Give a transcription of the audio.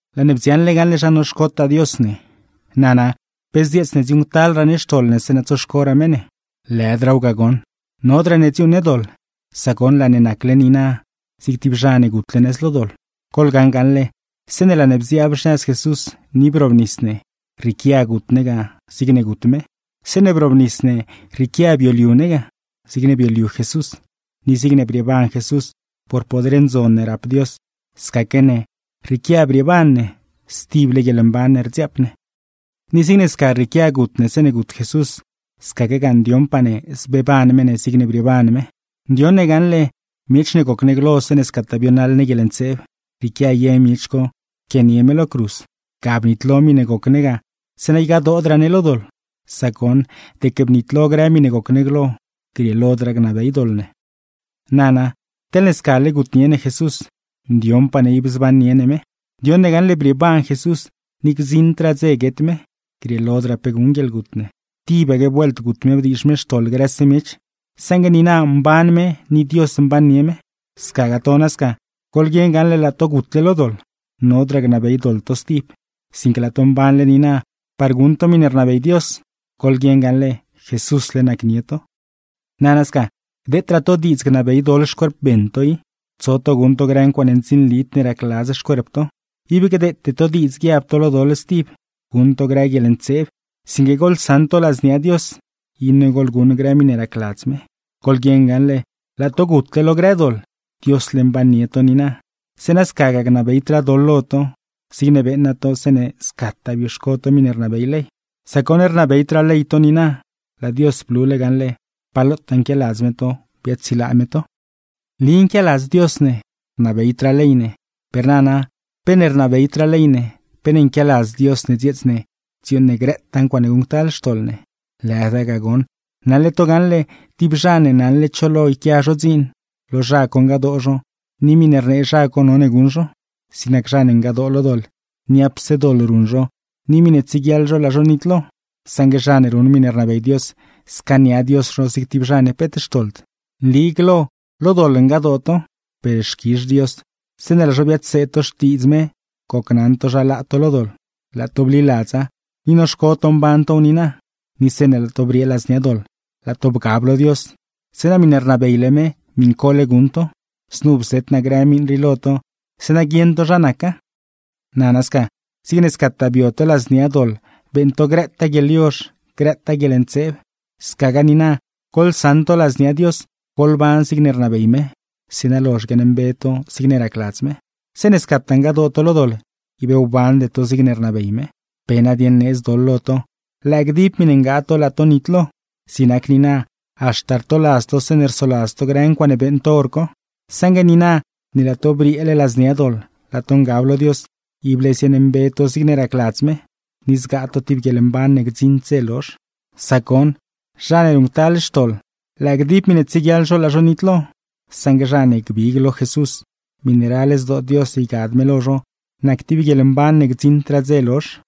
Laa ne bdziaṉle gaṉle zha noxcotaa Dios ne. Nana, ¿pe zdzieets ne dziuuṉctalraa ne xtoḻ ne zeeṉa tsoxcoraa me ne? ¡Lëdraaw ga goṉ! Nodraa ne dziuuṉ ne doḻ, sac goṉ, laa ne nacle niina zig tib zha ne gutle nëz lo doḻ. Goḻgaṉ gaṉle, zeeṉe laa ne bziaab xnëz Jesús ni brobnis ne, rrieequia gut ne ga zigne gut me. Zeeṉe brobnis ne rrieequia bioliu ne ga, zigne bioliu Jesús. Ni zigne brieeban Jesús (por poder ndzon ne rap Dios), scaque ne rrieequia brieeban ne, stible guieḻmban ne rdziaap ne. Ni zigne sca rrieequia gut ne zeeṉe gut Jesús, scaquegaa ndioṉpaa ne zbeeban me ne zigne brieeban me. Ndioṉ ne gaṉle, miech ne goc ne glo zeeṉe scataa bionaḻ ne guieḻntseeb, rrieequia ye miech co pquianie me lo cruz. Ga bnitlo miṉe goc ne ga, zeeṉa ygadoodraa ne lo doḻ; sac goṉ, deque bnitlo grë miṉe goc ne glo, grieelodraa gnabey doḻ ne. Nana, teḻne scale gutnie ne Jesús, ndioṉpaa ne ib zbannie ne me. Ndioṉ ne gaṉle brieeban Jesús, ni gdziṉdraa dze guet me. Grieelodraa pe guṉ guieḻgut me. Tibaque vuelt gut me bdiizh me xtoḻ grëse miech, saṉgue niina mban me ni Dios mbannie me. Scagaa to nasca, goḻguieṉ gaṉle laa to gutle lo doḻ, nodraa gnabey doḻ to stib, sinque laa to mbanle niina par guṉ to miṉe rnabey Dios. Goḻguieṉ gaṉle, Jesúsle nacnie to. Nana sca, gdeetraa to diidz gnabey doḻ xcuerp beṉ to i, tso to guṉ to grë ncuaaṉe ndzinlid ne racladz xcuerp to. Ib gdeete to diidz guiab to lo doḻ stib, guṉ to grë guieḻntseeb; sinque goḻsaṉ to ladznia Dios, iṉe goḻguṉ grë miṉe racladz me. Goḻguieṉ gaṉle, laa to gutle lo grë doḻ, Diosle mbannie to niina; zeeṉa scagaa gnabeydraa doḻ lo to, zigne beeṉa to zeeṉe scataa bioxco to miṉe rnabey ley. Sac goṉ rnabeydraa ley to niina, laa Dios blule gaṉle pa lotaa nquialadz me to biaadsilaa me to. Nli nquialadz Dios ne, rnabeydraa ley ne. Per nana, ¿pe ne rnabeydraa ley ne, pe ne nquialadz Dios ne dzieets ne dziuuṉ ne grëtaa ncuaaṉe guṉctal xtoḻ ne? ¡Lëda ga goṉ! Naṉle to gaṉle, tib zha ne naṉle cho lo yquia zho dziin, lo zha co ngadoo zho ni miṉe rnee zha co none guṉ zho. Zig nac zha ne ngadoo lo doḻ, niapse doḻ ruṉ zho ni miṉe tsieguiaḻ zho laa zho nitlo; saṉgue zha ne ruṉ miṉe rnabey Dios, scaania Dios zho zig tib zha ne peet xtoḻd. Nli glo lo doḻ ngadoo to, per xquizh Dios zeeṉe laa zho biadseed to Xtiidz me gocnaṉ to zha laa to lo doḻ, laa to bliladza ni noxco to mban tow niina. Ni zeeṉe laa to briee ladznia doḻ, laa to bgab lo Dios; zeeṉa miṉe rnabeyle me miṉcole guṉ to. Znu bzet naa grë miṉ rii lo to, zeeṉa guieṉ to zha naca. Nana sca, zigne scataa bio to ladznia doḻ beeṉ to grëtaa guieḻyozh, grëtaa guieḻntseeb, scagaa niina goḻsaṉ to ladznia Dios, goḻban zigne rnabey me, zeeṉa lozh guiaaṉmbe to zigne racladz me. Zeeṉe scataa ngadoo to lo doḻ, ib wbande to zigne rnabey me. ¿Pe nadieṉ needz doḻ lo to? Lëë gdib miṉe ngaa to laa to nitlo. Zig nac niina, haxta rtoladz to zeeṉe rsoladz to grë ncuaaṉe beeṉ to hor co. Saṉgue niina, ne laa to brieele ladznia doḻ laa to ngab lo Dios, ible ziaaṉmbe to zigne racladz me ni zgaa to tib guieḻmban ne gdziṉd dze lozh. Sac goṉ, zha ne ruṉctal xtoḻ, lëë gdib miṉe tsieguiaḻ zho laa zho nitlo; saṉgue zha ne gbig lo Jesús, miṉe ral zdoo Dios ygad me lo zho nac tib guieḻmban ne gdziṉdraa dze lozh.